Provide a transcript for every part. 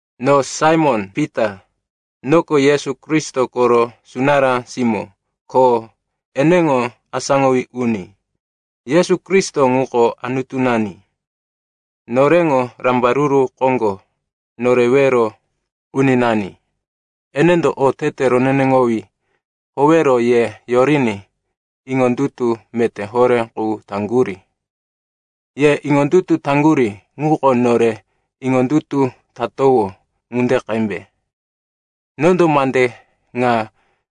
No Saimon-Pita, noko Yesu Kristo koro sunará simó ko eneŋo asáŋowí uni. Yesu Kristo ŋuko Anutunani, noreŋo Rambaruru Koŋgo Norewero Uninani. Enendo otete roneneŋowí howero ye yoriní iŋondutu meté horé qu taŋgurí. Ye iŋondutu taŋgurí ŋuko nore iŋondutu tatowó ŋunde qembe. Nondo mande ŋa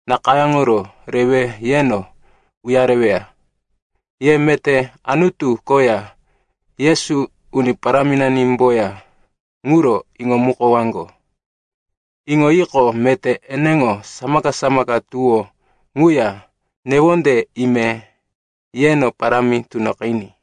nakayáŋoro rewe yeno uyareweya. Ye meté Anutu koya Yesu, Uni Paráminanimboya ŋuro iŋomukowaŋgo. Iŋoyiqo, meté eneŋo samaka-samaka tuwó ŋuya newonde ime yeno parámi tunoqiní.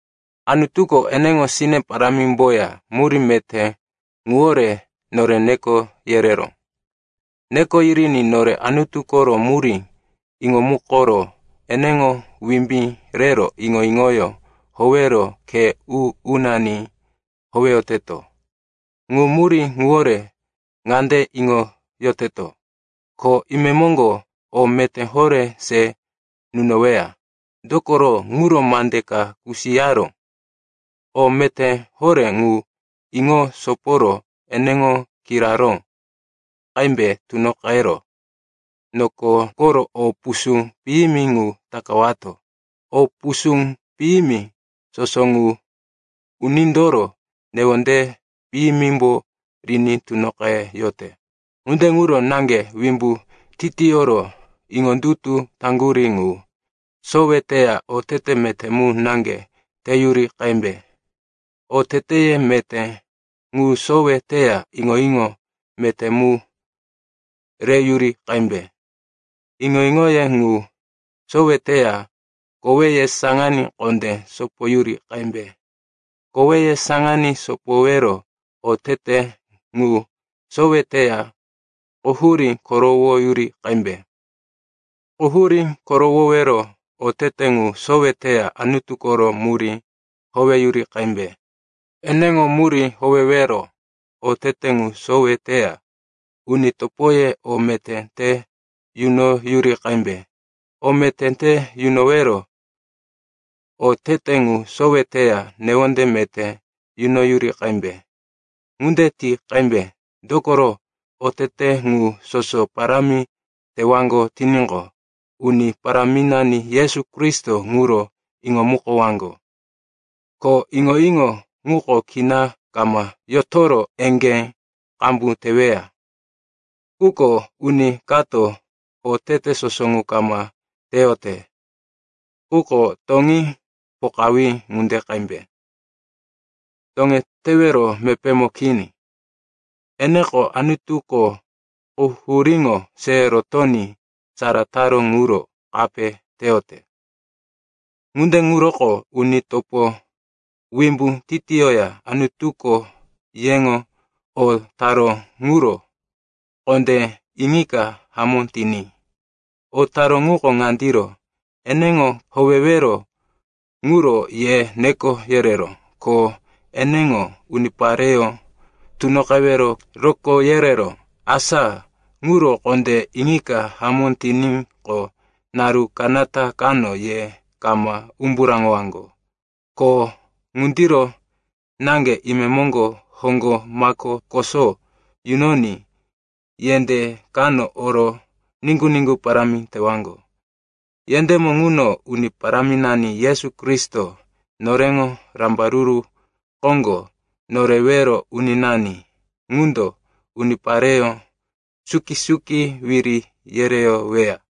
Anutuko eneŋo sine parámimboya murí meté ŋuwore nore neko yereró. Neko yiriní nore Anutu koro murí iŋomukoro eneŋo wimbí rero iŋo-iŋoyó howero khe u-unani howeyoteto. Ŋu murí ŋuwore ŋande iŋoyoteto, ko imemoŋgo o meté horé se nunoweya, dokoro ŋuro mande ka kusiyaró. O meté horé ŋu iŋo soporo eneŋo kiraró qembe tunoqero noko koro o pusú piyimi ŋu takawato. O pusú piyimi soso ŋu unindoro newonde piyimimbo riní tunoqeyote. Ŋunde ŋuro naŋge wimbu titiyoro iŋondutu taŋgurí ŋu sowe teya otete meté mu naŋge teyuri qembe. Oteteye meté ŋu sowe teya iŋo-iŋo meté mu reyuri qembe. Iŋo-iŋoye ŋu sowe teya koweye saŋaní kondé sopoyuri qembe. Koweye saŋaní sopowero otete ŋu sowe teya quhurí korowoyuri qembe. Quhurí korowowero otete ŋu sowe teya Anutu koro murí howeyuri qembe. Eneŋo murí howewero otete ŋu sowe teya uni topoye o meté te yunoyuri qembe. O meté te yunowero otete ŋu sowe teya newonde meté yunoyuri qembe. Ŋunde ti qembe, dokoro otete ŋu soso parámi tewaŋgo tiníqo, Uni Paráminani Yesu Kristo ŋuro iŋomukowaŋgo. Ko iŋo-iŋo ŋuko kina kama yotoro eŋgé qambu teweya. Quko uni kato otete soso ŋu kama teyote ŋuko toŋí pokawí ŋunde qembe, toŋetewero mepémo kini. Eneko Anutuko quhuríŋo se rotoní sara taró ŋuro kape teyote. Ŋunde ŋuroko, uni topo, wimbu titiyoya Anutuko yeŋo o taró ŋuro kondé iŋika hamó tiní. O taró ŋuko ŋandiro, eneŋo howewero ŋuro ye neko yereró, ko eneŋo unipareyó tunoqewero rokó yereró. Asa ŋuro kondé iŋika hamó tiníqo, naru kanata kano ye kama umbu raŋowaŋgo. Ko ŋundiro naŋge imemoŋgo hoŋgo mako koso yunoní yendé kano oro niŋgu-niŋgu parámi tewaŋgo. Yendémo ŋuno Uni Paráminani Yesu Kristo, noreŋo Rambaruru Koŋgo Norewero Uninani ŋundo unipareyó suki-suki wiri yereyoweya.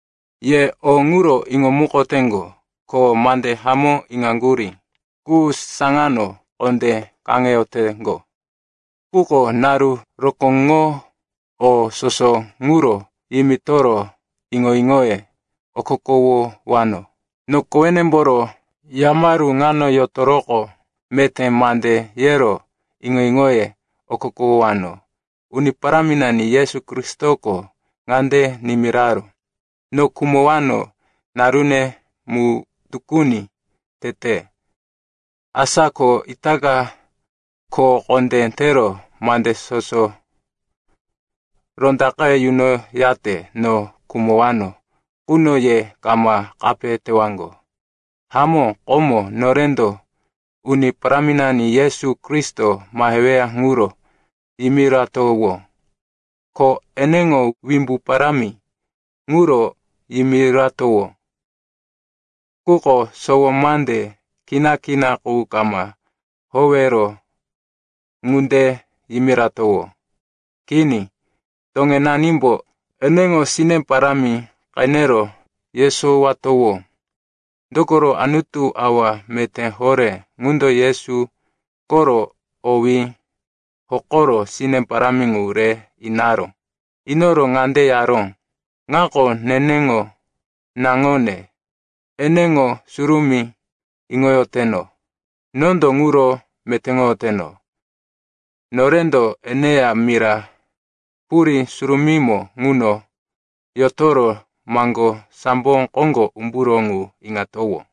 Ye o ŋuro iŋomukoteŋgo, ko mande hamó iŋaŋgurí qu saŋano kondé kaŋeyoteŋgo. Quko naru rokóŋo o soso ŋuro yimitoro iŋo-iŋoye okokowowano. No kowenemboro yamaru ŋano yotoroqo meté mande yero iŋo-iŋoye okokowowano. Uni Paráminani Yesu Kristoko ŋande nimiraró, no khumowano narune mu tukuni tete. Asa ko itaka kho kondé tero mande soso rondaqe yunoyate no khumowano quno ye kama kape tewaŋgo. Hamó, komo norendo Uni Paráminani Yesu Kristo maheweya ŋuro yimiratowó. Ko eneŋo wimbu parámi ŋuro yimiratowó. Quko sowo mande kina-kina qu kama howero ŋunde yimiratowó. Kini, toŋenanimbo eneŋo sine parámi qenero yesowatowó. Dokoro Anutu Awa Meté Horé ŋundo Yesu koro owí hokoro sine parámi ŋu re inaró. Inoro ŋande yaró, “Ŋako neneŋo naŋone, eneŋo surumí iŋoyoteno. Nondo ŋuro metéŋoyoteno.” Norendo eneya mira purí surumímo ŋuno yotoro maŋgó sambo koŋgo umburó ŋu iŋatowó.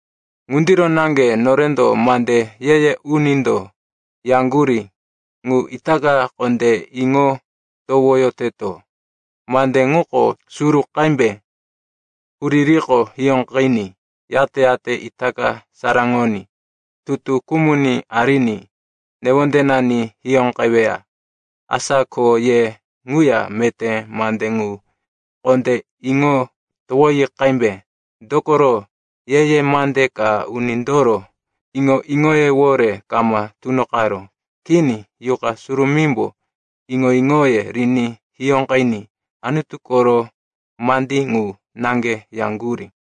Ŋundiro naŋge norendo mande ye-ye unindo yaŋgurí ŋu itaka kondé iŋo towoyoteto. Mande ŋuko suru qembe huririko hiyóqiní yate-yate ita saraŋoní tutu kumuní ariní newondenani hiyóqeweya. Asa ko ye ŋuya meté mande ŋu kondé iŋo towoyi qembe. Dokoro ye-ye mande ka unindoro iŋo-iŋoyewore kama tunoqaró. Kini, Yuqa Surumímbo iŋo-iŋoye riní hiyóqiní Anutu koro mandí ŋu naŋge yaŋgurí.